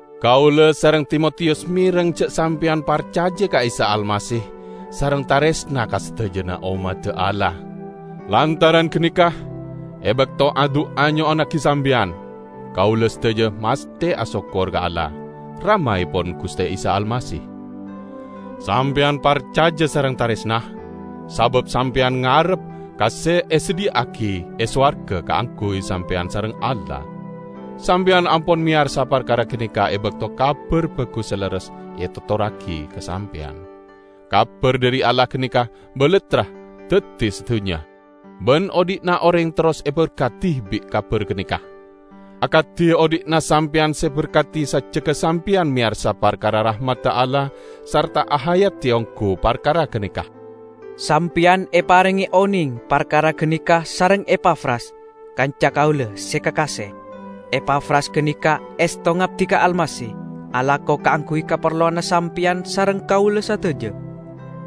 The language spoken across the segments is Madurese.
Kaula sareng Timotiyus mereng ja' sampeyan parcaja ka Isa Almasih sareng taresna ka sadajana ommadda Allah. Lantaran ganeka, e bakto adu'a nyo'onnagi sampeyan, kaula sadaja masthe asokkor ka Allah, Ramaepon Guste Isa Almasih. Sampeyan parcaja sareng taresna, sabab sampeyan ngarep ka se esadhiya'agi e sowarga kaangguy sampeyan sareng Allah. Sampeyan ampon meyarsa parkara ganeka e bakto Kabar Bagus se lerres etotorragi ka sampeyan. Kabar dhari Allah ganeka balattra daddi sadunnya, ban odhi'na oreng terros eberkadi bi' kabar ganeka, akadi odhi'na sampeyan se eberkadi sajjegga sampeyan meyarsa parkara rahmadda Allah sarta ahayadi onggu parkara ganeka. Sampeyan eparenge oneng parkara ganeka sareng Epafras, kanca kaula se kakase. Epafras ganeka esto ngabdi ka Almasih, alako kaangguy kaparlowanna sampeyan sareng kaula sadaja.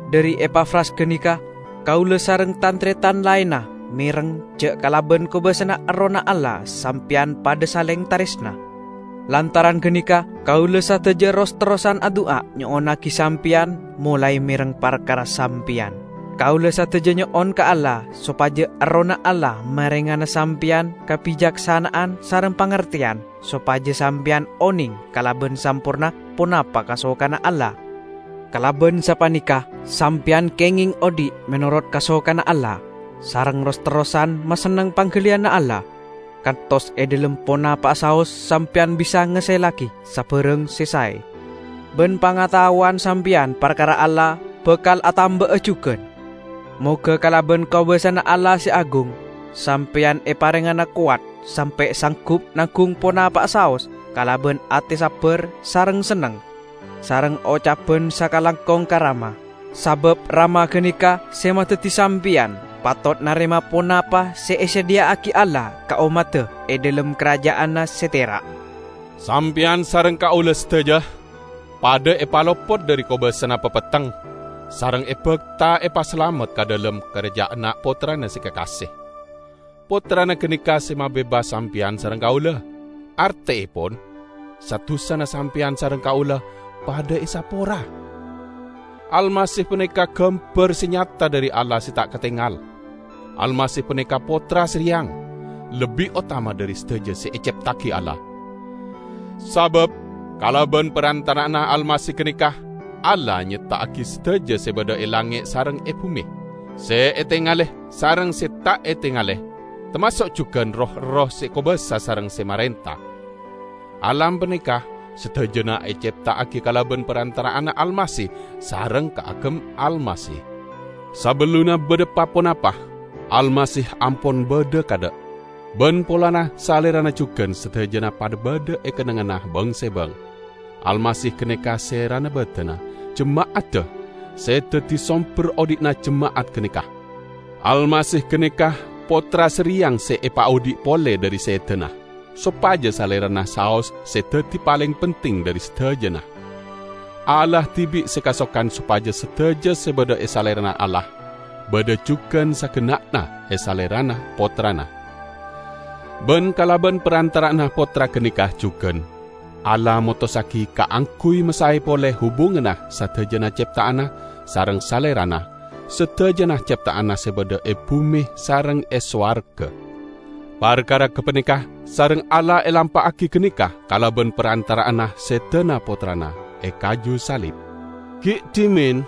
Dhari Epafras ganeka kaula sareng tan-taretan laenna mereng ja' kalaban kobasana Errohna Allah sampeyan padha saleng taresna. Lantaran ganeka kaula sadaja ros-terrosan adu'a nyo'onnagi sampeyan molae mereng parkara sampeyan. Kaula sadaja nyo'on ka Allah sopaja Errohna Allah marengana sampeyan kabicaksana'an sareng pangarteyan sopaja sampeyan oneng kalaban samporna ponapa kasokanna Allah. Kalaban sapaneka sampeyan kengeng odhi' menorot kasokanna Allah, sareng ros-terrosan masenneng panggaliyanna Allah, kantos e dhalem ponapa'a saos sampeyan bisa ngasellagi sabarang se sae. Ban pangataowanna sampeyan parkara Allah bakal atamba'a jugan. Moga kalaban kobasana Allah se agung, sampeyan eparengngana kowat sampe' sanggup nanggung ponapa'a saos kalaban ate sabbar sareng senneng, sareng ocaban sakalangkong ka Rama; sabab Rama ganeka se madaddi sampeyan patot narema ponapa se esadhiya'agi Allah ka ommadda e dhalem karaja'anna se tera'. Sampeyan sareng kaula sadaja padha epalopot dhari kobasana papetteng sareng ebakta epasalamet ka dhalem karaja'anna Pottrana se kakase. Pottrana ganeka se mabebas sampeyan sareng kaula, arteepon: sa-dusana sampeyan sareng kaula padha esapora. Almasih paneka gambar se nyata dhari Allah se ta' katengal; Almasih paneka Pottra sareyang, lebbi otama dhari sadaja se ecepta'agi Allah. Sabab kalaban parantara'anna Almasih ganeka Allah nyepta'agi sadaja se badha e langnge' sareng e bume, se etengale sareng se ta' etengale, tamaso' jugan roh-erroh se kobasa sareng se marenta. Alam paneka sadajana ecepta'agi kalaban parantara'anna Almasih sareng kaagem Almasih. Sabellunna badha pa-ponapa, Almasih ampon badha kaadha'. Ban polana Salerana jugan sadajana padha badha e kennengnganna bang-sebang. Almasih ganeka serana badanna, jema'adda, se daddi somber odhi'na jema'at ganeka. Almasih ganeka Pottra sareyang se epaodhi' pole dhari sedana, sopaja Salerana saos se daddi paleng penting dhari sadajana. Allah dibi' se kasokan sopaja sadaja se badha e Salerana Allah, badha jugan sagenna'na e Salerana Pottrana. Ban kalaban parantara'anna Pottra ganeka jugan Allah motossagi kaangguy masae pole hubunganna sadajana cepta'anna sareng Salerana -- sadajana cepta'anna se badha e bume sareng e sowarga. Parkara gapaneka sareng Allah elampa'agi ganeka kalaban parantara'anna sedana Pottrana e kaju salib. Gi' dhimen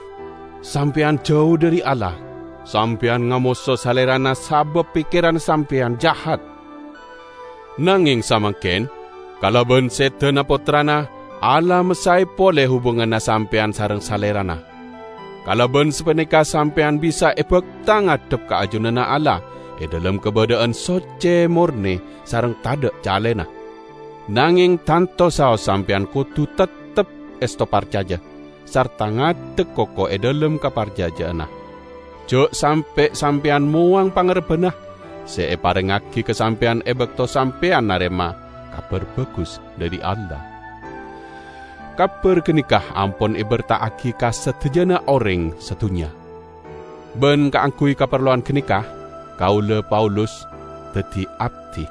sampeyan jau dhari Allah, sampeyan ngamoso Salerana sabab pekkeranna sampeyan jahat. Nangeng samangken, kalaban sedana Pottrana, Allah masae pole hubunganna sampeyan sareng Salerana. Kalaban sapaneka sampeyan bisa ebakta ngadhep ka ajunanna Allah e dhalem kabadha'an socce, morne sareng tadha' calena. Nangeng tanto saos sampeyan kodu teptep esto parcaja sarta ngadek koko e dhalem kaparcaja'anna. Ja' sampe' sampeyan mowang pangarebbanna se eparengngagi ka sampeyan e bakto sampeyan narema Kabar Bagus dhari Allah. Kabar ganeka ampon eberta'agi ka sadajana oreng sadunnya. Ban kaangguy kaparlowan ganeka, kaula, Paulus, daddi abdi.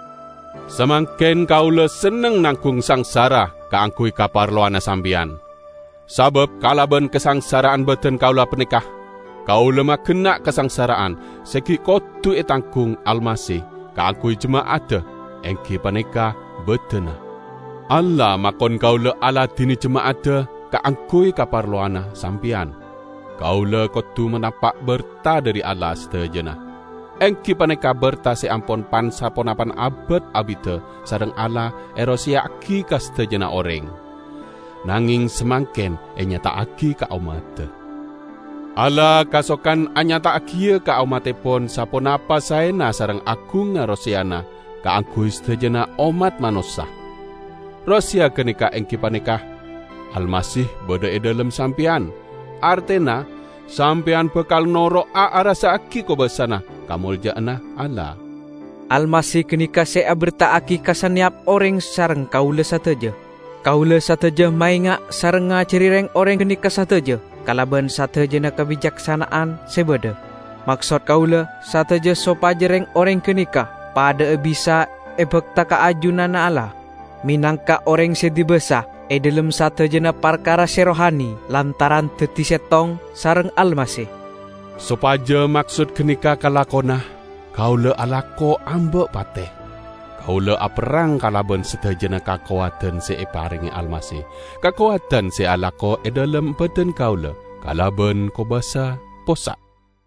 Samangken kaula senneng nanggung sangsara kaangguy kaparlowanna sampeyan. Sabab kalaban kasangsara'an badan kaula paneka, kaula magenna' kasangsara'an se gi' kodu etanggung Almasih kaangguy jema'adda, enggi paneka badanna. Allah makon kaula aladine jema'adda kaangguy kaparlowanna sampeyan. Kaula kodu manapa' berta dhari Allah, sadajana; enggi paneka berta se ampon pan-saponapan abad abidda sareng Allah eroseya'agi ka sadajana oreng, nangeng samangken enyata'agi ka ommadda. Allah kasokan anyata'agiya ka ommattepon saponapa saena sareng agungnga roseyana kaangguy sadajana ommat manossa. Roseya ganeka enggi paneka: Almasih badha e dhalem sampeyan, artena sampeyan bakal noro'a arassa'agi kobassana kamolja'anna Allah. Almasih ganeka se eberta'agi ka saneyap oreng sareng kaula sadaja. Kaula sadaja maenga' sareng ngajari reng-oreng ganeka sadaja kalaban sadajana kabicaksana'an se badha; maksod kaula sadaja sopaja reng-oreng ganeka padha'a bisa ebakta ka ajunanna Allah, menangka oreng se dibasa e dhalem sadajana parkara se rohani lantaran daddi settong sareng Almasih. Sopaja maksod ganeka kalakona, kaula alako amba' pate. Kaula aperrang kalaban sadajana kakowadan se eparenge Almasih, kakowadan se alako e dhalem badan kaula kalaban kobasa possa'.